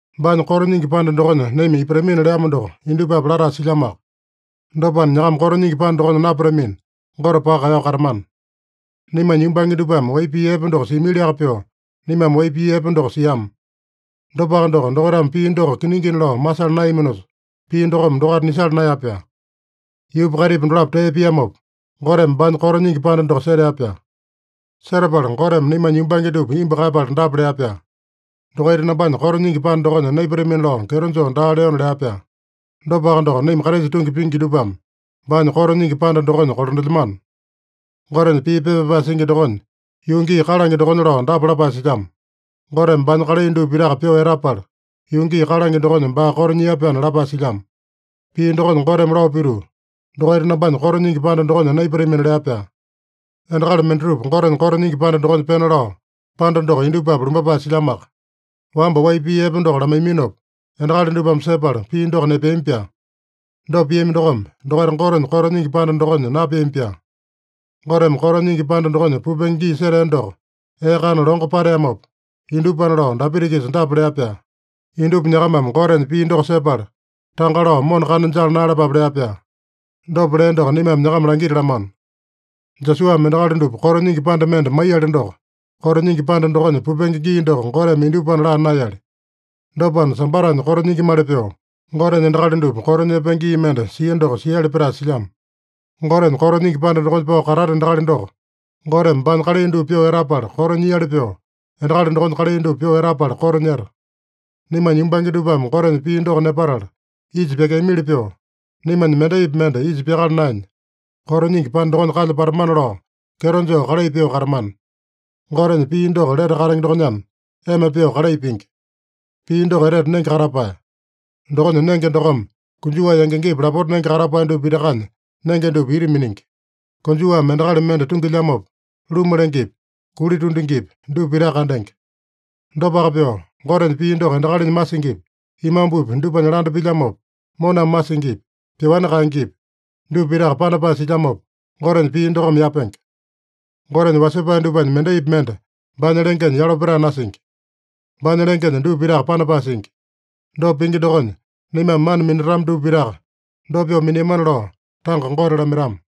Baanya koto nyingi panda dokonya naima ipatamina leamo doko indupapi latae silyamoaka. Dopana, nyakama koto nyingi panda dokonya napatamina, Gote paka kaeyao katamana. Naimanya yumbange dupame wai pii epe doko siamiliaka pyoo, naimame wai pii epe doko siama. Dopaka doko, dokaitame pii doko kiningina lao masala naeyaminosa, pii dokome dokaita nisala naeya-pyaa. Yuupa kaitipa dolapo tee piamopa, Goteme baanya koto nyingi panda doko setea-pyaa. Setapala Goteme naimanya yumbange dupa imbu kaeyapala dapa lea-pyaa: “Dokaita nambanya koto nyingi panda dokonya naipatamina lao kyeto joo daa leona” lea-pyaa. Dopaka doko, naima Kraisa tungi pingi dupame baanya koto nyingi panda dokonya kolandelyamano. Gotenya pii pepa pyapae singi dokonya, yuu gii kalange dokonya lao dapa lapae silyamo: “Goteme baanya kalai dupa pitaka pyoo etapala, yuu gii kalange dokonya baa koto nyia-pyaana” lapae silyamo. Pii dokonya Goteme lao pituu, “Dokaita nambanya koto nyingi panda dokonya naipatamina” lea-pyaa. Endakali mendatupa Gotenya koto nyingi panda dokonya pena lao, panda doko indupapi lumbapae silyamoaka. Wamba wai pii epe doko lamaiyaminopa, endakali dupame sepala pii doko nepeami-pyaa. Dopa piami dokome, dokaita Gotenya koto nyingi panda dokonya napeami-pyaa. Goteme koto nyingi panda dokonya pupenge gii setea doko, ee kana longo pateamopa, indupana lao Dapita-kisa dapa lea-pyaa: “Indupa nyakamame Gotenya pii doko sepala, tanga lao mona kana jala naeyalapape” lea-pyaa. Dopa lea doko naimame nyakama langitalamano. Josuame endakali dupa koto nyingi panda mende maiyali doko, koto nyingi panda dokonya pupenge gii doko Goteme indupana laa naeyali. Dopana, Sambatanya koto nyingimali pyoo, Gotenya endakali dupa koto nyepenge gii mende sia doko siali petae silyamo. Gotenya koto nyingi panda dokonya pao katata endakali doko, Goteme baanya kalai dupa pyoo etapala koto nyiali pyoo, endakali dokonya kalai dupa pyoo etapala koto nyeta. Naimanya yumbange dupame Gotenya pii doko nepatala isa pyakeamili pyoo, naimanya mendaipi mende isa pyakala naenya, koto nyingi panda dokonya kalya patamana lao kyeto joo kalai pyoo katamana. Gotenya pii doko lete katenge dokonyana, ema pyoo kalai pingi. Pii doko etete nenge katapae. Dokonya nenge dokome konjuwa yangi-yangipa lapota nenge katapae dupa pitakanya nenge dupa ita miningi. Konjuwame endakali mende tungilyamopa, luma lengepi, kuli tundingipi, dupa pitaka kandenge. Dopaka pyoo, Gotenya pii doko endakalinya masingipi, imambupi dupanya landa pilyamopa, moname masingipi, pyoani kaengepi, dupa pitaka panapae silyamopa, Gotenya pii dokome yapenge. Gotenya wasepae dupanya mendaipi mende baanya lengenya yalo petae nasingi. Baanya lengenya dupa pitaka panapae singi. Dopa pingi dokonya, naimame mana minatama dupa pitaka, dopa pyoo miniamana lao tanga Gote lamaitama.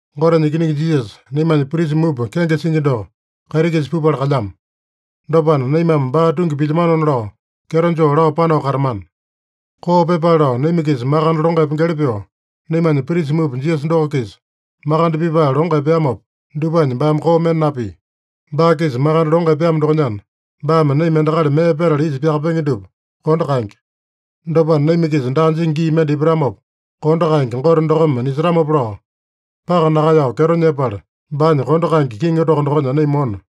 Gotenya Ikiningi Jisasa, naimanya prisa mupa kenge singi doko, kaiti-kisa pupala kalyamo. Dopana, naimame baa tungi pilyamanona lao, kyeto joo lao panao katamana. Koo pyepale lao naima-kisa makande longo epengeli pyoo, naimanya prisa mupa Jisasa doko-kisa makande pipae longo epeamopa, dupanya baame koo mende napia. Baa-kisa makande longo epeamo dokonyana, baame naima endakali mee petala isa pyakapenge dupa kondo kaenge. Dopana, naima-kisa daa jingi gii mende ipatamopa, kondo kaenge Gote dokome nisetamopa lao, paka nakaeyao kyeto nyepala, baanya kondo kaenge kiŋi toko dokonya naima mona.